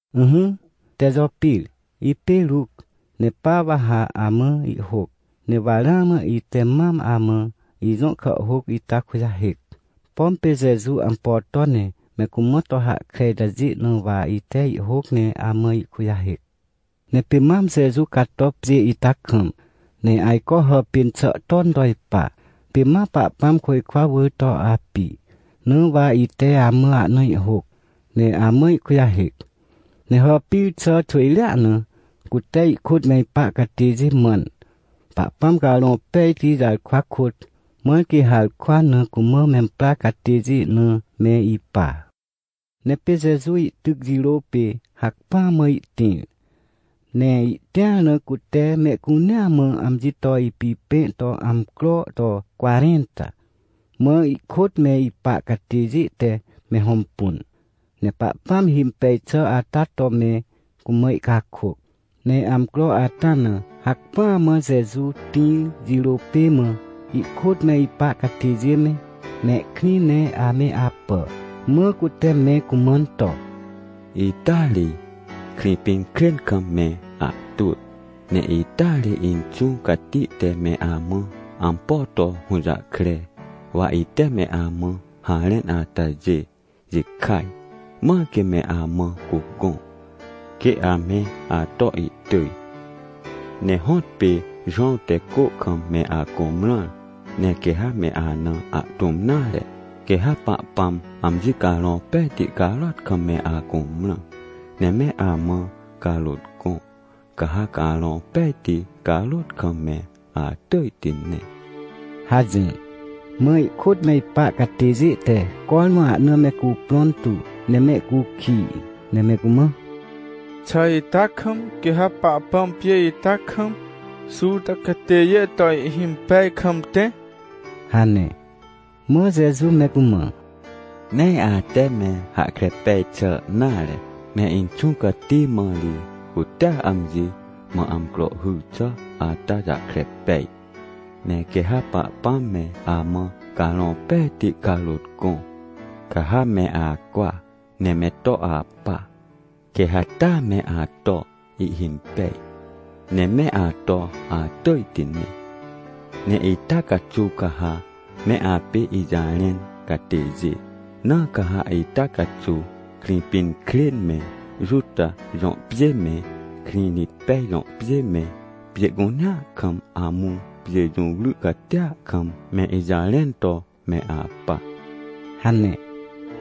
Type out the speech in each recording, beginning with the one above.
Ỹhỹ, Tejopir, ipê Ruc, ne pa wa ha amã ihhôc. Ne wa ramã ite mam amã ijõ kàhhôc ita kujahêc. Pom pê Jeju ampo to, ne me cumã to hahkre itajê na wa ite ihhôc, ne amã ihkujahêc. Ne pê mam Jeju cato pjê ita kam, ne ajco hàpên xà ton to ipa, pê ma Pahpãm côjkwa wỳr to api, na wa ite amã ahna ihhôc, ne amã ihkujahêc. Ne hàpir xà xwỳjrea na cute ihkôt me ipa catêjê mãn, Pahpãm Carõ Pejti jarkwa kôt, mãr quê harkwa na cumã memprar catêjê na me ipa. Ne pê Jeju ihtyc jirô pê hacpỹa mã ihtĩr, ne ihtĩar na cute mehcunea mã amji to ipipẽ to amcro to cwarẽnta. Mã ihkôt me ipa catêjê te me hõmpun, ne Pahpãm himpej xà ata to me cumã ihcakôc. Ne amcro ata na, hacpỹa mã Jeju tĩr jirô pê mã, ihkôt me ipa catêjê me, mehkrĩ ne ame apà. Mã cute me cumãn to: — Ita ri, Krĩpinkrên kam me ahtwỳ, ne ita ri Inxũ Cati te me amã ampo to hũjahkre, wa ite me amã harẽn atajê jikaj, mãr quê me amã cugõ, quê ame ato ihtỳj. Ne hõtpê Jowãw te cô kam me acumrãr, ne quê ha me ana ahtũm nare, quê ha Pahpãm amji Carõ Pejti carôt kam me acumrã. Ne me amã carôt gõ, ca ha Carõ Pejti carôt kam me atỳjti ne — hajỹr. Mã ihkôt me ipa catêjê te cormã ahna me cuprõn tu ne mehcukij, ne me cumã: — Xà ita kam, quê ha Pahpãm pjê ita kam, Juta catêjê to ihhimpej kam tẽ? — hane. Mã Jeju me cumã: — Nee ate me hahkre pej xà nare. Ne Inxũ Cati mã ri cutea amji mã amcro hyr xà ata jahkre pej. Ne quê ha Pahpãm me amã Carõ Pejti carôt gõ, ca ha me acwa ne me to apa, quê ha taa me ato ihhimpej, ne me ato atỳjti ne. Ne ita caxuw ca ha me apê ijarẽn catêjê. Na ca ha ita caxuw Krĩpinkrên me, Juta jõ pjê me, Krĩrĩtpej jõ pjê me, pjê cunea kam amũ pjê jũwry catia kam me ijarẽn to me apa ― hane.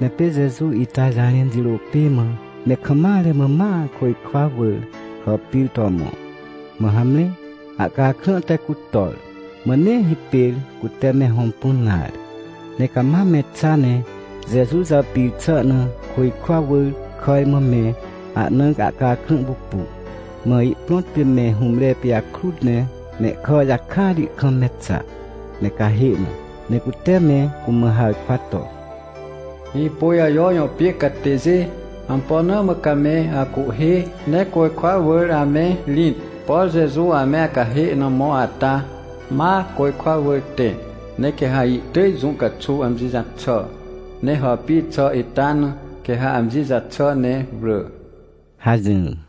Ne pê Jeju ita jarẽn jirô pê mã me kam mare mã ma côjkwa wỳr hàpir to mõ. Mã hamre, ahcakrã te cutor, mã nee hipêr cute me hõmpun nare. Ne cama me xa ne Jeju jàpir xà na, côjkwa wỳr, kàj mã me ahna ahcakrã pupu. Mã ihprõt pê me hũmre pijakrut ne mehkà jakati kam me xa, me cahê na, ne cute me cumã harkwa to: — Hĩpôjajo jõ pjê catêjê, ampo na mã ca me acuhhê ne côjkwa wỳr ame rĩt? Por Jeju ame acahê na mõ ata, ma côjkwa wỳr tẽ, ne quê ha ihtỳj jũ caxuw amji jaxà, ne hàpir xà ita na, quê ha amji jaxà ne wrỳ — hajỹr.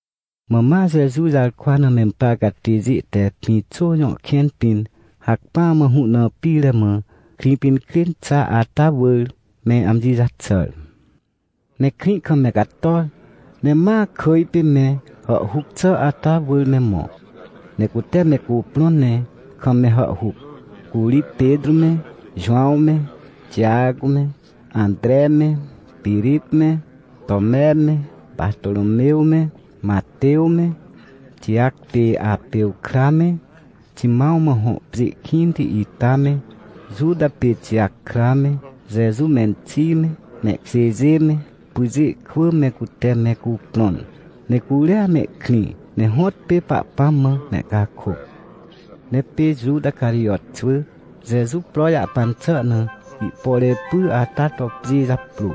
Mã ma Jeju jarkwa na memprar catêjê te Pĩxô jõ kẽn pĩn hacpỹa mã hũ na pire mã, Krĩpinkrên xa ata wỳr, me amji jaxàr. Ne krĩ kam me cator, ne ma kỳj pê me hàhhuc xà ata wỳr me mõ, ne cute me cuprõn ne kam me hàhhuc. Curi Petrô me, Jowãw me, Tijac me, Antre me, Pirip me, Tome me, Partômew me, Matew me, Tijac pê Arpew kra me, Ximãw mã hõ pjê kĩnti ita me, Juta pê Tijac kra me, Jeju menxi me, mehkjêjê me, pyjê kwỳ me cute me cuprõn. Ne curia mehkrĩ, ne hõtpê Pahpãm mã mehcakôc. Ne pê Juta Carijot xwỳ, Jeju pro jahpan xà na ihpore py ata to pjê japrô.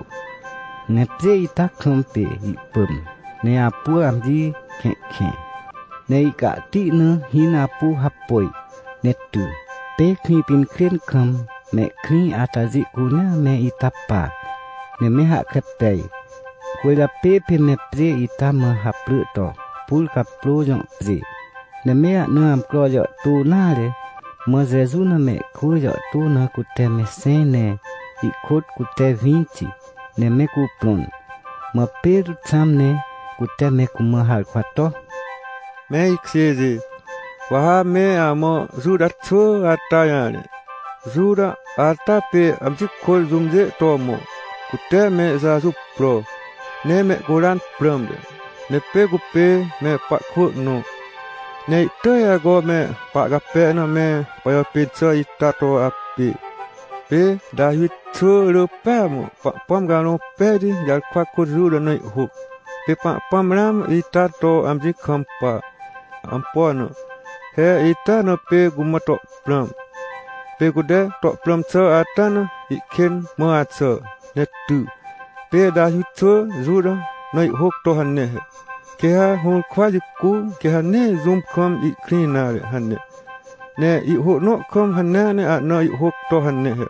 Ne pjê ita kam pê ihpỳm, ne apu amji kẽhkẽ, ne ihcahti na hĩn apu hapôj, ne ty. Pê Krĩpinkrên kam, mehkrĩ atajê cunea me ita pa, ne me hahkre pej. Cwỳrjapê pê me pjê ita mã haprỳ to, Purcaprô jõ pjê. Ne me ahna amcro jàhtô nare, mã Jeju na mehkwỳ jàhtô na cute me xẽj ne ihkôt cute winti ne me cuprõn. Mã Petrô xãm ne cute me cumã harkwa to: — Me ikjêjê, wa ha me amã Juta xwỳ ata jarẽ. Juta ata pê amji kôt jũmjê to mõ, cute me Jeju pro, ne mehcuran prãmte. Ne pê cupê me pahkwỳ nõ, ne ihtỳj ajco me pahcape na me pajàpên xà ita to apê. — Pê Tawi xwỳ rỳ pêa mã Pahpãm Carõ Pejti jarkwa kôt Juta na ihhôc, pê Pahpãm ramã ita to amji kampa. Ampo na? He ita na pê cumã to prãm. Pê cute to prãm xà ata na ihkên mã axà, ne ty. Pê Tawi xwỳ Juta na ihhôc to hane he: “Quê ha hũrkwa jicu, quê ha nee jũm kam ihkrĩ nare” hane. Ne ihhô nõ kam hanea ne ahna ihhôc to hane he: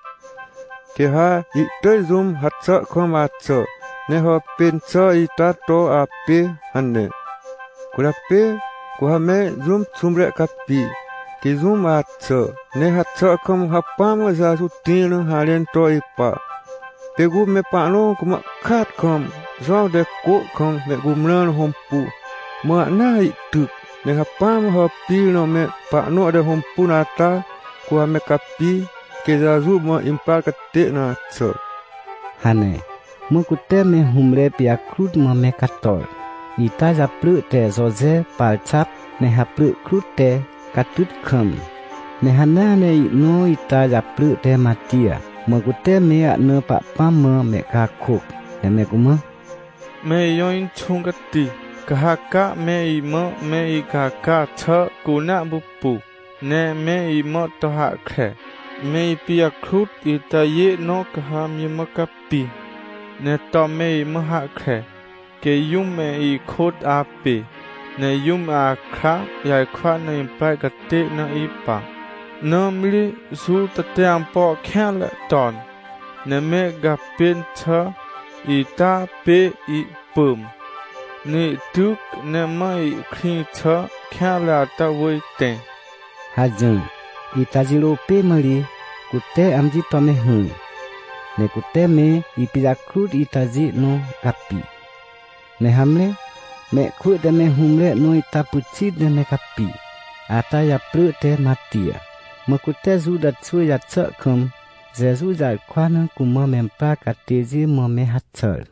“Quê ha ihtỳj jũm haxà kam axà, ne hàpên xà ita to apê” hane. Cwỳrjapê cu ha me jũm xũmre capi, quê jũm axà, ne haxà kam hacpỹa mã Jeju tĩr na harẽn to ipa. Pê cu me pahnõ cumã kaat kam Jowãw te cô kam mehcumrãr na hõmpu, mã ahnaa ihtyc, ne hacpỹa mã hàpir na me pahnõ te hõmpun ata, cu ha me capi, quê Jeju mã imprar catê na axà — hane. Mã cute me hũmre pijakrut mã me cator, ita japrỳ te Joje Parxap, ne haprỳ krut te Catytkam, ne hanea ne ihnõ ita japrỳ te Matij. Mã cute me ahna Pahpãm mã mehcakôc, ne me cumã: — Me ijõ Inxũ Cati, ca ha ca me imã me icaca xà cunea pupu. Ne me imã to hahkre, me ipijakrut itajê nõ ca ha amji mã capi, ne to me imã hahkre, quê jũm me ikôt apê, ne jũm akra jarkwa na imprar catê na ipa. Nãmri Juta te ampo kêanre ton, ne me gàpên xà ita pê ihpỳm, ne ihtyc, ne ma ihkrĩ xà kêanre ata wỳr tẽ — hajỹr. Ita jirô pê mã ri, cute amji to me hỹr, ne cute me ipijakrut itajê nõ capi. Ne hamre, mehkwỳ te me hũmre nõ ita pyxit ne me capi, ata japrỳ te Matij, mã cute Juta xwỳ jaxà kam Jeju jarkwa na cumã memprar catêjê mã me haxàr.